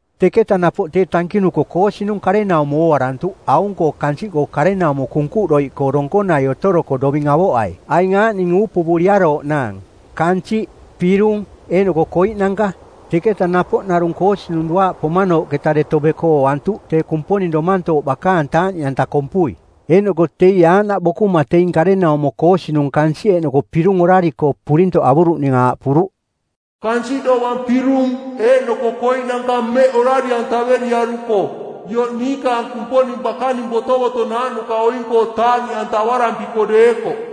Teketa napoꞌ tee tankinuko koosinung karenaumo ooarantuꞌ aung-koo kansiꞌkoo karenaumo kunkuꞌdoiꞌkoo donkonai otoroko doving avoꞌai aing aaꞌning uupuvuriarooꞌnaang: kansiꞌ, pirung, eeꞌnoko koiꞌnanka. Teketa napoꞌ narung koosinung duaaꞌ pomanooꞌketa deto beko ooantuꞌ tee Kumponing Domantooꞌ bakaang taaꞌniꞌanta kompui, eeꞌnoko teie aaꞌnaꞌ bokuma teing karenaumo koosinung kansiꞌ eeꞌnoko pirung orari-koo purintoꞌ avuruꞌning aaꞌpuruꞌ, “Kansiꞌ dovang pirung eeꞌnoko koiꞌnanka mmeꞌka orari-antaveriaruko ioꞌ niikaang Kumponing bakaning botovotonaaꞌnuka oing-koo taaꞌniꞌantavarampiko deekoꞌ.”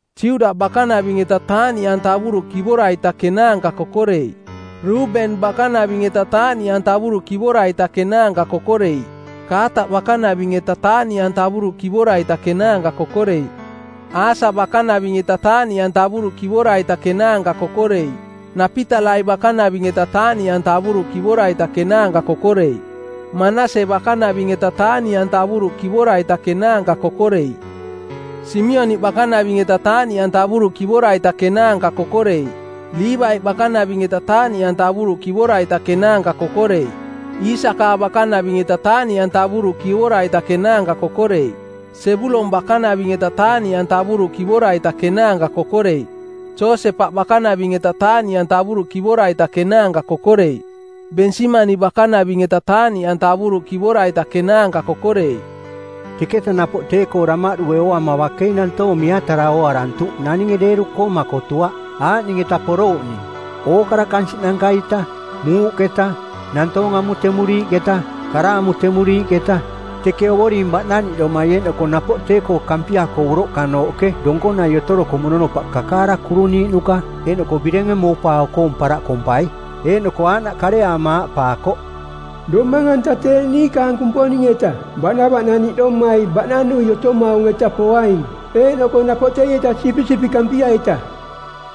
Juda bakanaving-eta taaꞌniꞌantavuruꞌ kivora-ita kenaanka kokoreiꞌ. Ruben bakanaving-eta taaꞌniꞌantavuruꞌ kivora-ita kenaanka kokoreiꞌ. Kaataꞌ bakanaving-eta taaꞌniꞌantavuruꞌ kivora-ita kenaanka kokoreiꞌ. Asa bakanaving-eta taaꞌniꞌantavuruꞌ kivora-ita kenaanka kokoreiꞌ. Napitalai bakanaving-eta taaꞌniꞌantavuruꞌ kivora-ita kenaanka kokoreiꞌ. Manase bakanaving-eta taaꞌniꞌantavuruꞌ kivora-ita kenaanka kokoreiꞌ. Simioniꞌ bakanaving-eta taaꞌniꞌantavuruꞌ kivora-ita kenaanka kokoreiꞌ. Liivaiꞌ bakanaving-eta taaꞌniꞌantavuruꞌ kivora-ita kenaanka kokoreiꞌ. Iisakaa bakanaving-eta taaꞌniꞌantavuruꞌ kivora-ita kenaanka kokoreiꞌ. Sebulon bakanaving-eta taaꞌniꞌantavuruꞌ kivora-ita kenaanka kokoreiꞌ. Josepaꞌ bakanaving-eta taaꞌniꞌantavuruꞌ kivora-ita kenaanka kokoreiꞌ. Bensimani bakanaving-eta taaꞌniꞌantavuruꞌ kivora-ita kenaanka kokoreiꞌ. Teketa napoꞌ tee-koo damaꞌdue ooama bakei nantoong miatara ooarantuꞌ naninge deeru-koo makotuaꞌ, aaꞌning-eta porouꞌning: ookara kansiꞌnanka-ita, muuꞌketa, nantoong amutemuriiꞌketa, kara amutemuriiꞌketa, teke Ovoring baꞌnaniꞌdomai eeꞌnoko napoꞌ tee-koo Kampia-koo uroꞌkanooꞌke donkonai otoroko mononopaꞌ kakaara kuruniiꞌnuka eeꞌnoko birenge moupaao-koong paraꞌ kompai. Eeꞌnoko aaꞌnaꞌ kareaama aaꞌpaakoꞌ, “Domang-anta tee niikaang Kumponing-eta baꞌnavaꞌnaniꞌdomai baꞌnanui otomaung-eta poaing eeꞌnoko napoꞌ teieta Sipisipiꞌ Kampia-ita.”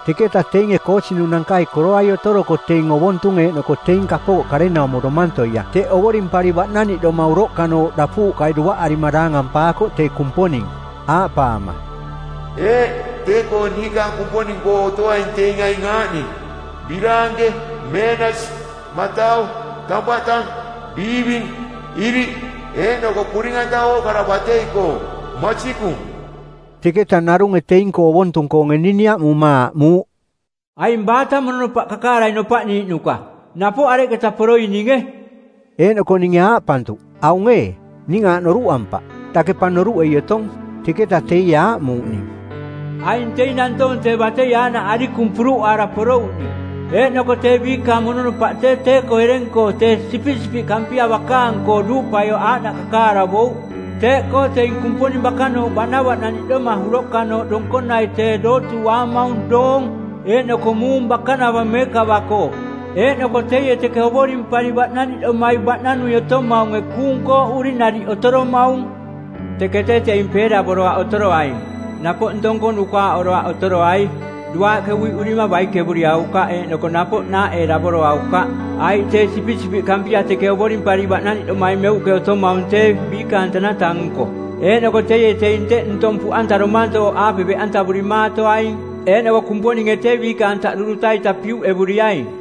Teketa teinge koosinunankai koroai otoroko teing ovontung eeꞌnoko teing kapooꞌ karenaumo domantoia teꞌ ovorimpari baꞌnavaꞌnaniꞌdoma uroꞌkanooꞌ dapuuꞌkai duaꞌarima daangampaakoꞌ tee Kumponing, aaꞌpaama, “Eeꞌ, tee-koo niikaang Kumponing-koo otoaing teing aing aaꞌning: biraanke, meenasi, matau, tampaꞌ tang, biiving, iriꞌ, eeꞌnoko puring-anta ookara batei-koo. Masikung.” Teketa narunge teing-koo ovontung-koonge ning niaꞌmuma aaꞌmuuꞌ, “Aing baata mononopaꞌ kakaarai nopaꞌniiꞌnuka? Napoꞌ areketa poroininge?” Eeꞌnoko ninge aaꞌpantuꞌ, “Aung ee, ning aaꞌ noruꞌampaꞌ. Dake pa noruꞌei otong.” Teketa teie aaꞌmuuꞌ ning, “Aing teing nantoong tee batei aaꞌnaꞌ arikung puruꞌaara porouꞌning. Eeꞌnoko tee biikaang mononopaꞌ tee tee-koo ereng-koo tee Sipisipiꞌ Kampia bakaang-koo duuꞌpaioꞌ aaꞌnaꞌ kakaaravouꞌ. Teeꞌkoo teing Kumponing bakanooꞌ baꞌnavaꞌnaniꞌdoma uroꞌkanooꞌ donkonai tee dootuuꞌaamaung doong eeꞌnoko muung bakanava meekava-koo, eeꞌnoko teie teke ovorimpari baꞌnaniꞌdomai baꞌnanui otomaunge kuung kooꞌuri nariꞌ otoromaung. Teke tee teing peeravoroaꞌ otoroaing, napoꞌ ntong-koo nukaaꞌoroaꞌ otoroai, duaaꞌke uiꞌurima baikevuriaukaꞌ eeꞌnoko napoꞌ naaꞌeeravoroaukaꞌ. Aiꞌ tee Sipisipiꞌ Kampia teke ovorimpari baꞌnavaꞌnaniꞌdomai meuꞌke otomaung tee biikaang tanata-nko, eeꞌnoko teie teing teꞌ ntong puꞌanta domantooꞌaape beꞌantavurimatoaing, eeꞌnoko Kumponinge tee biikaang taꞌdu duta-ita piuꞌevuriaing.”